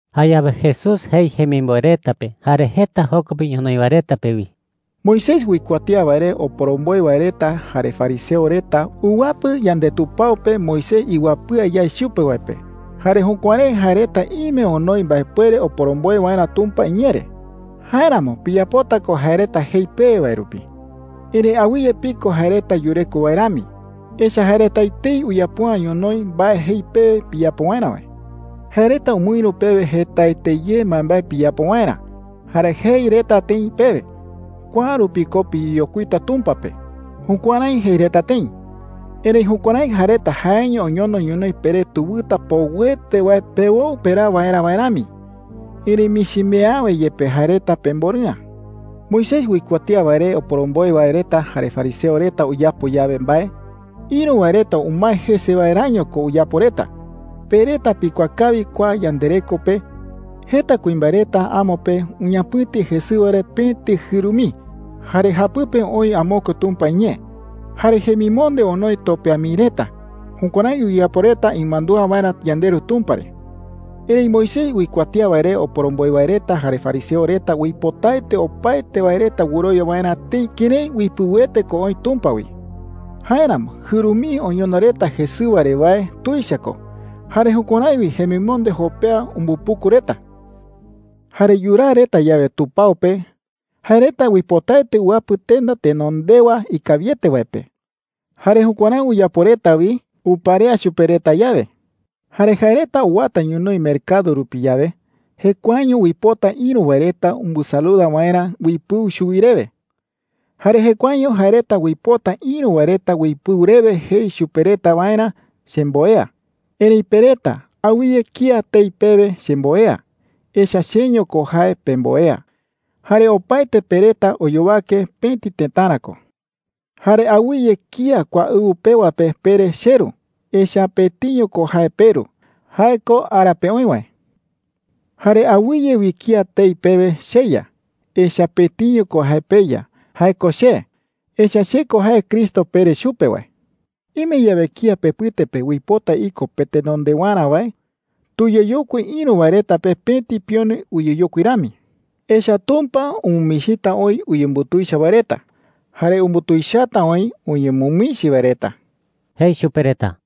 Jayawe Jesús jei jemimboe reta pe jare jeta joko pe ñonoï wae reta pe wi: “Moisés uikuatía wae re oporomboe wae reta jare fariseo reta uwapɨ yandetupao pe Moisés iwapɨa yae chupe wae pe. Jare jukuärái jae reta ime onoi mbaepuere oporomboe waerä Tumpa iñee re. Jáeramo piyapota ko jae reta jei pewe wae rupi,” jei. “Erëi awɨye piko jae reta yureko wae rami, echa’ä jae reta etei uyapo’ä ñonoï mbae jei pewe piyapo waerä wae,” jei. “Jae reta umɨïru pewe jetaete ye mbaembae piyapo waerä, jare jei reta tëi pewe: ‘Kua rupi ko piyeyokuita Tumpa pe.’ Jukuärái jei reta tëi. Erëi jukuärái jae reta jaeño oñono ñonoï peré tewɨta poɨete wae pewoɨ peraa waerä wae rami. Erëi michi mii awe yepe jae reta pemborɨ'ä,” jei chupe reta. “Moisés uikuatía wae re oporomboe wae reta jare fariseo reta uyapo yawe mbae, ïru wae reta umae jese waeräño ko uyapo reta. Pe reta pikuaa kawi kua yandereko pe jeta kuimbae reta amo pe uñapɨ̈ti jesɨwa re pëti jɨru mii, jare japɨpe oï amokue Tumpa iñee. Jare jemimonde onoi topea mii reta. Jukuärái uyapo reta imandúa waerä yandeRu Tumpa re,” jei. “Erëi Moisés uikuatía wae re oporomboe wae reta jare fariseo reta uipotaete opaete wae reta wɨrowia waerä tëi kërái uipɨuete ko oï Tumpa wi. Jáeramo jɨru mii oñono reta jesɨwa re wae tuicha ko, jare jukuärái wi jemimonde jopea umbupuku reta,” jei chupe reta. “Jare yuraa reta yawe tupao pe, jae reta uipotaete uwapɨ tenda tenondewa ikawiete wae pe. Jare jukuärái uyapo reta wi uparea chupe reta yawe,” jei. “Jare jae reta uwata ñonoï mercado rupi yawe, jekuaeño uipota ïru wae reta umbɨsaluda waerä uipɨu chuwi rewe. Jare jekuaeño jae reta uipota ïru wae reta uipɨu rewe jei chupe reta waerä, ‘Chemboea.’ “Erëi pe reta, awɨye kía tei pewe, ‘Chemboea.’ Echa’ä cheño ko jae pemboea, jare opaete pe reta oyowake pëti tëtara ko,” jei chupe reta. “Jare awɨye kía kua ɨwɨ pewa pe pere, ‘Cheru.’ Echa’ä pëtiño ko jae peRu – jae ko ara pe oï wae,” jei chupe reta. “Jare awɨye wi kía tei pewe, ‘Cheya.’ Echa’ä pëtiño ko jae peYa – jae ko che. Echa’ä che ko jae Cristo pere chupe wae,” jei chupe reta. “Ime yawe kía pepɨte pe uipota iko petenondewarä wae, tuyeyokui ïru wae reta pe pëti pione uyeyokui rami. Echa’ä Tumpa umɨmichita oï uyembutuicha wae reta, jare umbutuichata oï uñemɨmichi wae reta,” jei chupe reta.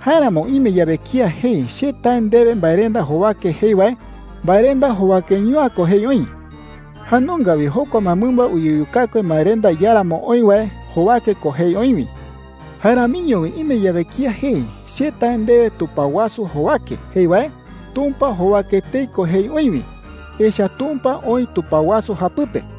“Jáeramo ime yawe kía jei, ‘Che tae ndewe mbaerenda jowake,’ jei wae, mbaerenda jowakeño’ä ko jei oï. Jae nunga wi jokua mbaemɨmba uyeyukakue mbaerenda iáramo oï wae jowake ko jei oï wi,” jei. “Jae ramiño wi ime yawe kía jei, ‘Che tae ndewe tupao wasu jowake,’ jei wae, Tumpa jowake etei ko jei oï wi, echa’ä Tumpa oï tupao wasu japɨpe,” jei.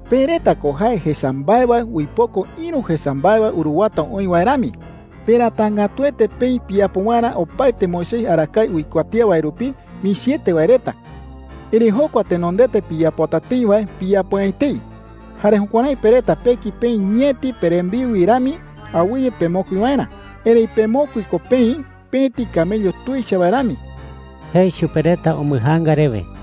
“Pe reta ko jae jesa mbae wae uipoko ïru jesa mbae wae uruwata oï wae rami. Peratangätuete peï piyapo waerä opaete Moisés arakae uikuatía wae rupi michiete wae reta. Erëi jokua tenondete piyapota tëi wae piyapo’ä etei. Jare jukuärái pe reta peki peï ñeti perembiu wi rami awɨye pemokui waerä, erëi pemokui ko peï pëti camello tuicha wae rami,” jei chupe reta umbɨjaanga rewe.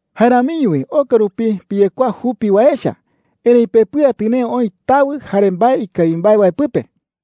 “Jae ramiño wi oka rupi piyekuaa jupi wae echa, erëi pepɨa tɨnee oï tawɨ jare mbae ikawi mbae wae pɨpe.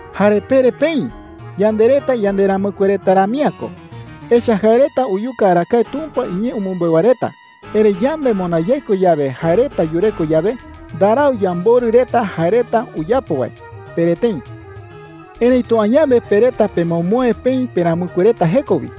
Jare pere peï: ‘Yande reta yanderamɨkue reta rami’ä ko. Echa’ä jae reta uyuka arakae Tumpa iñee umɨmbeu wae reta. Erëi yande moná yaiko yawe jae reta yureko yawe, ndarau yamborɨ reta jae reta uyapo wae,’ pere tëi. Erëitu añawe pe reta pemomoe peï peramɨkue reta jeko wi.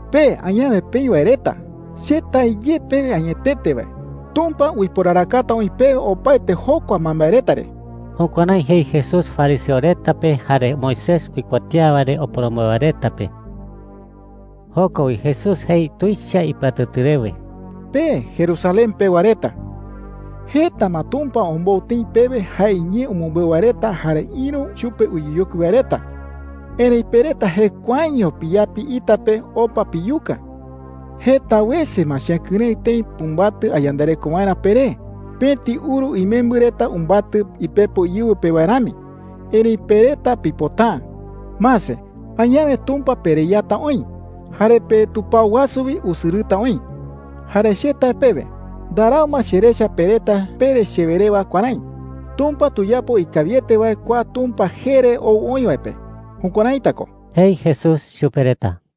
“Pe añawe peï wae reta, che tae ye pewe añetete wae, Tumpa uiporarakata oï pewe opaete jokua mbaembae reta re.” Jukuärái jei Jesús fariseo reta pe jare Moisés uikuatía wae re oporomboe wae reta pe. Joko wi Jesús jei tuicha ipɨatɨtɨ rewe: “Pe Jerusalén pewa reta, jeta ma Tumpa ombou tëi pewe jae iñee umɨmbeu wae reta jare ïru chupe uyeyokui wae reta. Erëi pe reta jekuaeño piyapi ita pe opa piyuka,” jei. “Jeta wese ma chekɨrëɨ tëi pumbatɨ ayandareko waerä peré, pëti uru imembɨ reta umbatɨ ipepo íɨwɨ pe wae rami, erëi pe reta pipota’ä,” jei. “Mase, añawe Tumpa pereyata oï, jare petupao wasu wi usɨrɨta oï. Jare che tae pewe, ndarau ma cherecha pe reta pere chewe rewa kuärái: ‘Tumpa tuyapo ikawiete wae kua Tumpa jee re ou oï wae pe.’ Jukuäraita ko,” jei Jesús chupe reta.